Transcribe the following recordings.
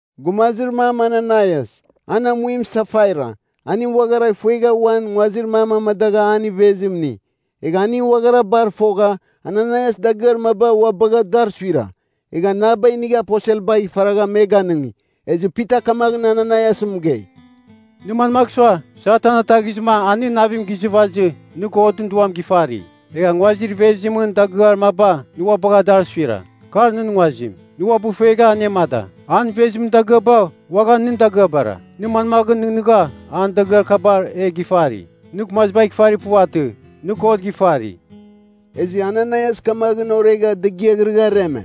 Gumazir mam Ananaias, an amuim Safaira, aning uaghara fuegha uan nguazir mam amadagha an ivezim ini. Egha aning uaghara bar fogha, Ananaias dagɨar maba ua bagha dar suira. Egha naba inigha aposelbagh ifaragha me ganɨngi. Ezɨ Pita kamaghɨn Ananaias mɨgei, “Nɨ manmagh sua, Satan ataghizɨma a nɨn navim gizɨvazɨ, nɨ Godɨn Duam gifari? Egha nguazir ivezimɨn dagɨar maba nɨ ua bagha dar suira? Kar nɨn nguazim, nɨ uabɨ ifuegha anemada. An ivezimɨn dagɨaba uaghan nɨn dagɨabara. Nɨ manmaghɨn nɨghnɨgha an dagɨar kabar e gifari? Nɨ gumazibagh ifari puvatɨ, nɨ God gifari.” Ezɨ Ananaias kamaghɨn oregha degiaghrɨgha areme.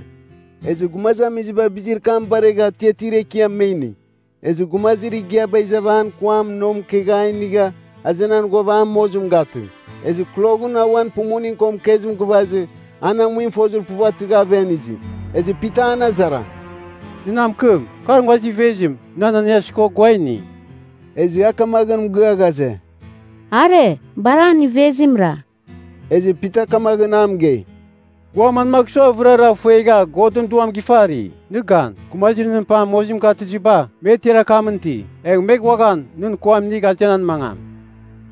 Ezɨ gumazamiziba bizir kam baregha atiatir ekiam me ini. Ezɨ gumazir igiaba izava an kuam nomkegha a inigha azenan ghuava a mozim gatɨ. Ezɨ kloghɨn auan pumuning ko mɨkezim gɨvazɨ, an amuim fozir puvatɨgha aven izi. Ezɨ Pita an azara, “Nɨ na mɨkɨm, kar nguazir ivezim, nɨ Ananaias ko gua a ini?” Ezɨ a kamaghɨn mɨgɨa ghaze, “Are, bar an ivezimra.” Ezɨ Pita kamaghɨn a mɨgei, “Gua manmagh sua vɨrara fuegha Godɨn Duam gifari? Nɨ gan! Gumazir nɨn pam mozim gatɨziba, me tiar akamɨn iti. Egh me uaghan nɨn kuam inigh azenan mangam.”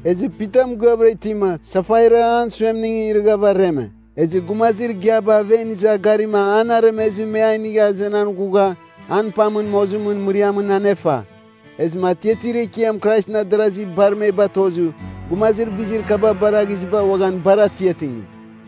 Ezɨ Pita mɨgɨavɨra itima, Safaira an suemningɨn irɨghava areme. Ezɨ gumazir igiaba aven iza garima an aremezɨ me a inigha azenan ghugha an pamɨn mozimɨn mɨriamɨn anefa. Ezɨma atiatir ekiam Kraisɨn adarazi bar me batozɨ, gumazir bizir kaba baraghiziba uaghan bar atiatingi.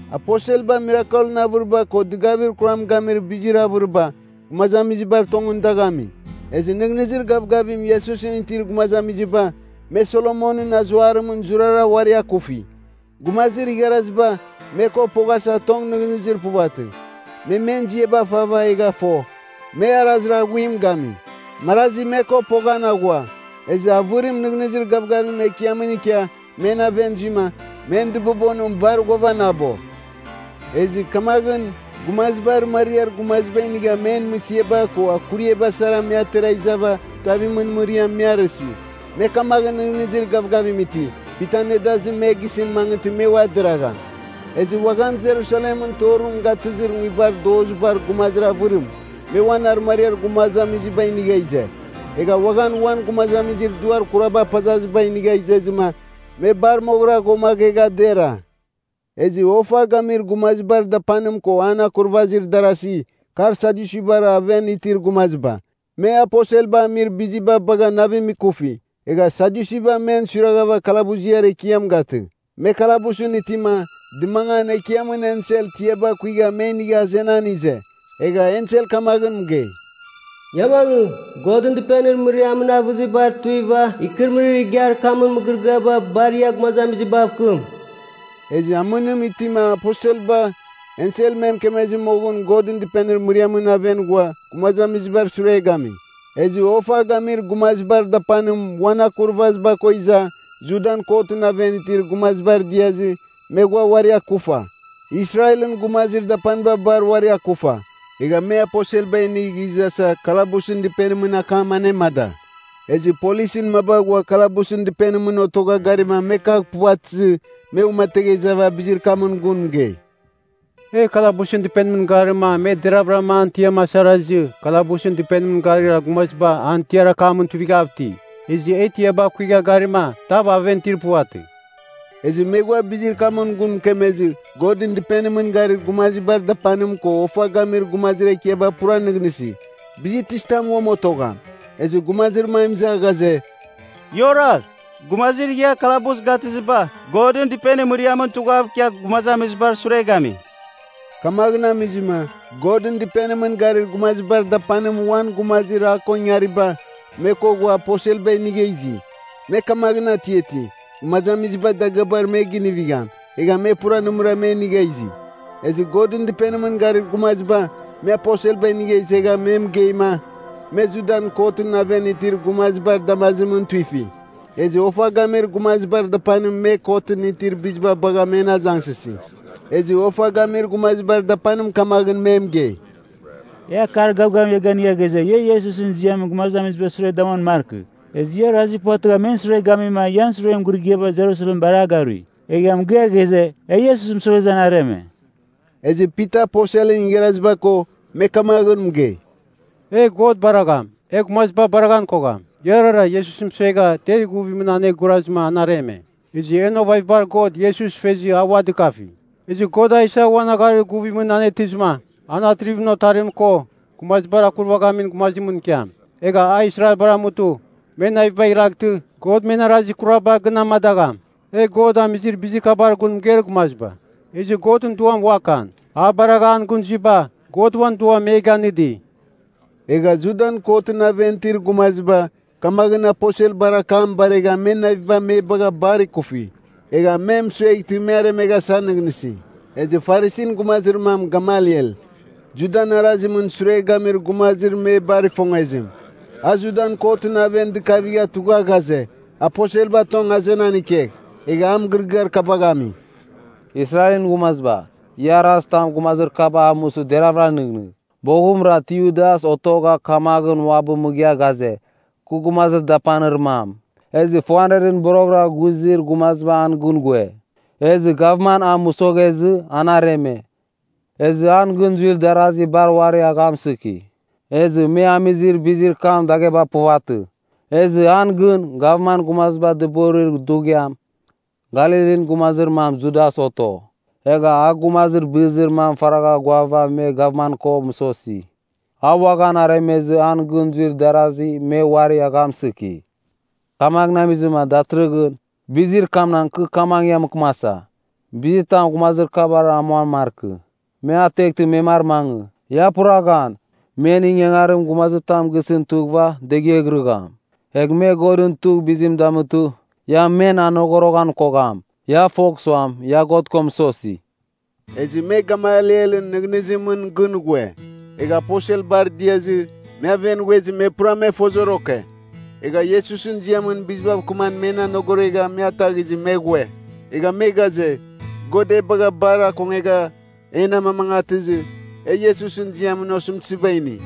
Aposelba mirakelɨn avɨriba ko dɨgavir kuram gamir bizir avɨriba, gumazamizibar tongɨn dagh ami. Ezɨ nɨghnɨzir gavgavim Iesusɨn itir gumazamiziba, me Solomonɨn Azuarimɨn zurara uari akufi. Gumazir igharaziba, me ko poghasa tong nɨghnɨzir puvatɨ. Me men ziaba fava egha fo, me arazir aghuim gami. Marazi me ko poghan aghua, ezɨ avɨrim nɨghnɨzir gavgavim Ekiamɨn ikia men aven zuima, men dɨbobonim bar ghuavanabo. Ezɨ kamaghɨn gumaziba arɨmariar gumaziba inigha men mɨsiaba ko akuriaba sara me atera izava tuavimɨn mɨriamɨn me arɨsi. Me kamaghɨn nɨghnɨzir gavgavim iti, Pitan nedazim me gisɨn mangɨtɨ me ua deragham. Ezɨ uaghan Jerusalem torim gatɨzir nguibar dozibar gumazir avɨrim, me uan arɨmariar gumazamiziba inigha ize. Egha uaghan uan gumazamizir duar kuraba apazaziba inigha izezɨma, me bar moghɨra ghuamaghegha dera. Ezɨ ofa gamir gumazibar dapanim ko an akurvazir darasi, kar Sadyusibar aven itir gumaziba. Me aposelba amir biziba bagha navim ikufi. Egha Sadyusiba men suiragha kalabuziar ekiam gatɨ. Me kalabusɨn itima, dɨmangan Ekiamɨn ensel tiaba kuigha me inigha azenan ize. Egha ensel kamaghɨn mɨgei, “Ia mangɨ, Godɨn Dɨpenir mɨriamɨn avɨzibar tuiva ikɨrɨmɨrir igiar kamɨn mɨgɨrɨgɨaba bar, ia gumazamizibav kɨm.” Ezɨ amɨnim itima aposelba, ensel me mɨkemezɨ moghɨn Godɨn Dɨpenir mɨriamɨn aven ghua, gumazamizibar sure gami. Ezɨ ofa gamir gumazibar dapanim uan akurvaziba ko iza, Judan kotɨn aven itir gumazibar diazɨ, me ghua uari akufa. Israelɨn gumazir dapaniba bar uari akufa. Egha me aposelba inigh izasa kalabusɨn dɨpenimɨn akam anemada. Ezɨ polisɨn maba ghua kalabusɨn dɨpenimɨn otogha garima me kagh puvatɨzɨ, me uamategha izava bizir kamɨn gun mɨgei, “E kalabusɨn dɨpenimɨn garima me deravɨra an tiam asarazɨ kalabusɨn dɨpenimɨn garir gumaziba an tiar akamɨn tuivighav iti. Ezɨ e tiaba kuigha garima, tav aven itir puvatɨ.” Ezɨ me ghua bizir kamɨn gun mɨkemezɨ, Godɨn Dɨpenimɨn garir gumazibar dapanim ko ofa gamir gumazir ekiaba pura nɨghnɨsi, bizir tizitam uam otogham? Ezɨ gumazir mam iza ghaze, “Ia oragh! Gumazir ia kalabus gatɨziba Godɨn Dɨpenir mɨriamɨn tughav ikia gumazamizibar sure gami.” Kamaghɨn amizɨma Godɨn Dɨpenimɨn garir gumazibar dapanim uan gumazir a ko ingariba, me ko ghua aposelba inigha izi. Me kamaghɨn atiati, gumazamiziba dagɨabar me ginivigham, egha me pura nɨmɨra me inigha izi. Ezɨ Godɨn Dɨpenimɨn garir gumaziba, me aposelba inigha izegha me mɨgeima, me Judan kotɨn aven itir gumazibar damazimɨn tuifi. Ezɨ ofa gamir gumazibar dapanim me kotɨn iitir bizim bagha men azangsɨsi. Ezɨ ofa gamir gumazibar dapanim kamaghɨn me mɨgei, “E akar gavgavim ia ganɨga ghaze, ia Iesusɨn ziamɨn gumazamizibar sure damuan markɨ! Ezɨ ia orazir puvatɨgha men sure gamima ian suren mɨgɨrɨgɨaba Jerusalem bar a garui. Egha mɨgɨa ghaze, e Iesus mɨsoghezɨ an areme.” Ezɨ Pita aposelɨn igharaziba ko, me kamaghɨn mɨgei, “E God baragham, e gumaziba baraghan kogham.” Iarara Iesus mɨsuegha ter ighuvimɨn an gurazɨma an areme. Ezɨ en ovavabar God Iesus fezɨ a ua dɨkafi. Ezɨ God a isa uan agharir guvimɨn anetɨzɨma, an Atrivimɨn Otarim ko gumazibar Akurvaghamin Gumazimɨn ikiam. Egha a Israelbar amutɨ me navibagh iraghtɨ God men arazir kuraba gɨn amadagham. E God amizir bizir kabar gun mɨgeir gumaziba, ezɨ Godɨn Duam uakan. A baragha an gɨn zuiba, God uan Duam me ganɨdi. Egha Judan kotɨn aven itir gumaziba kamaghɨn aposelbar akam baregha men naviba me bagha bar ikufi. Egha me mɨsueghtɨ me aremeghasa nɨghnɨsi. Ezɨ Farisin gumazir mam Gamaliel, Judan arazimɨn sure gamir gumazir me bar ifongezim. A Judan kotɨn aven dɨkavigha tugha, ghaze, aposelba tong azenan ikegh. Egha a mɨgɨrɨgɨar kabagh ami, “Israelɨn gumaziba, ia arazitam gumazir kabar amusɨ deravɨra nɨghnɨgh. Boghɨmra Teudas otogha kamaghɨn uabɨ mɨgɨa ghaze, kɨ gumazir dapanir mam, ezɨ 400ɨn boroghɨra ghuzir gumaziba an gɨn ghue. Ezɨ gavman a mɨsoghezɨ, an areme. Ezɨ an gɨn zuir darazi bar uari aghamsɨki. Ezɨ me amizir bizir kam dagheba puvatɨ. Ezɨ an gɨn, gavman gumaziba dɨborir dughiam, Galilin gumazir mam Judas oto. Egha, a gumazir bɨzir mamɨn faragha ghuava me gavman ko mɨsosi. A uaghan aremezɨ an gɨn zuir darasi, me uari aghamsɨki. Kamaghɨn amizɨma datɨrɨghɨn, bizir kamnagh kɨ kamaghɨn ia mɨkɨmasa. Bizitam gumazir kabar amuan markɨ! Me ateghtɨ me mar mangɨ! Ia pura gan, men ingangarim gumazitam gisɨn tughɨva, degeghirɨgham. Egh me Godɨn tugh bizim damutɨ, ia men anogoroghan kogham. Ia fogh suam, ia God ko mɨsosi.” Ezɨ me Gamalielɨn nɨghnɨzimɨn gɨn ghue. Egha aposelbar diazɨ, me aven ghuezɨ me pura me fozoroke. Egha Iesusɨn ziamɨn bizibav kɨman men anogoregha me ataghizɨ me ghue. Egha me ghaze, God e bagha bar akongegha en amamangatɨzɨ, e Iesusɨn ziamɨn osɨmtɨziba ini.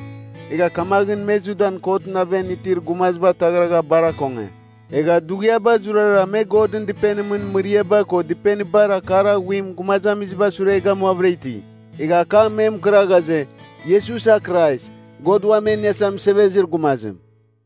Egha kamaghɨn me Judan kotɨn aven itir gumaziba ataghragha bar akonge. Egha dughiaba zurara me Godɨn Dɨpenimɨn mɨriaba ko dɨpenibar akar aghuim gumazamiziba sure gamuavɨra iti. Egha akam me mɨkɨra ghaze, Iesus a Krais, God Uam E Iniasa Mɨsevezir Gumazim.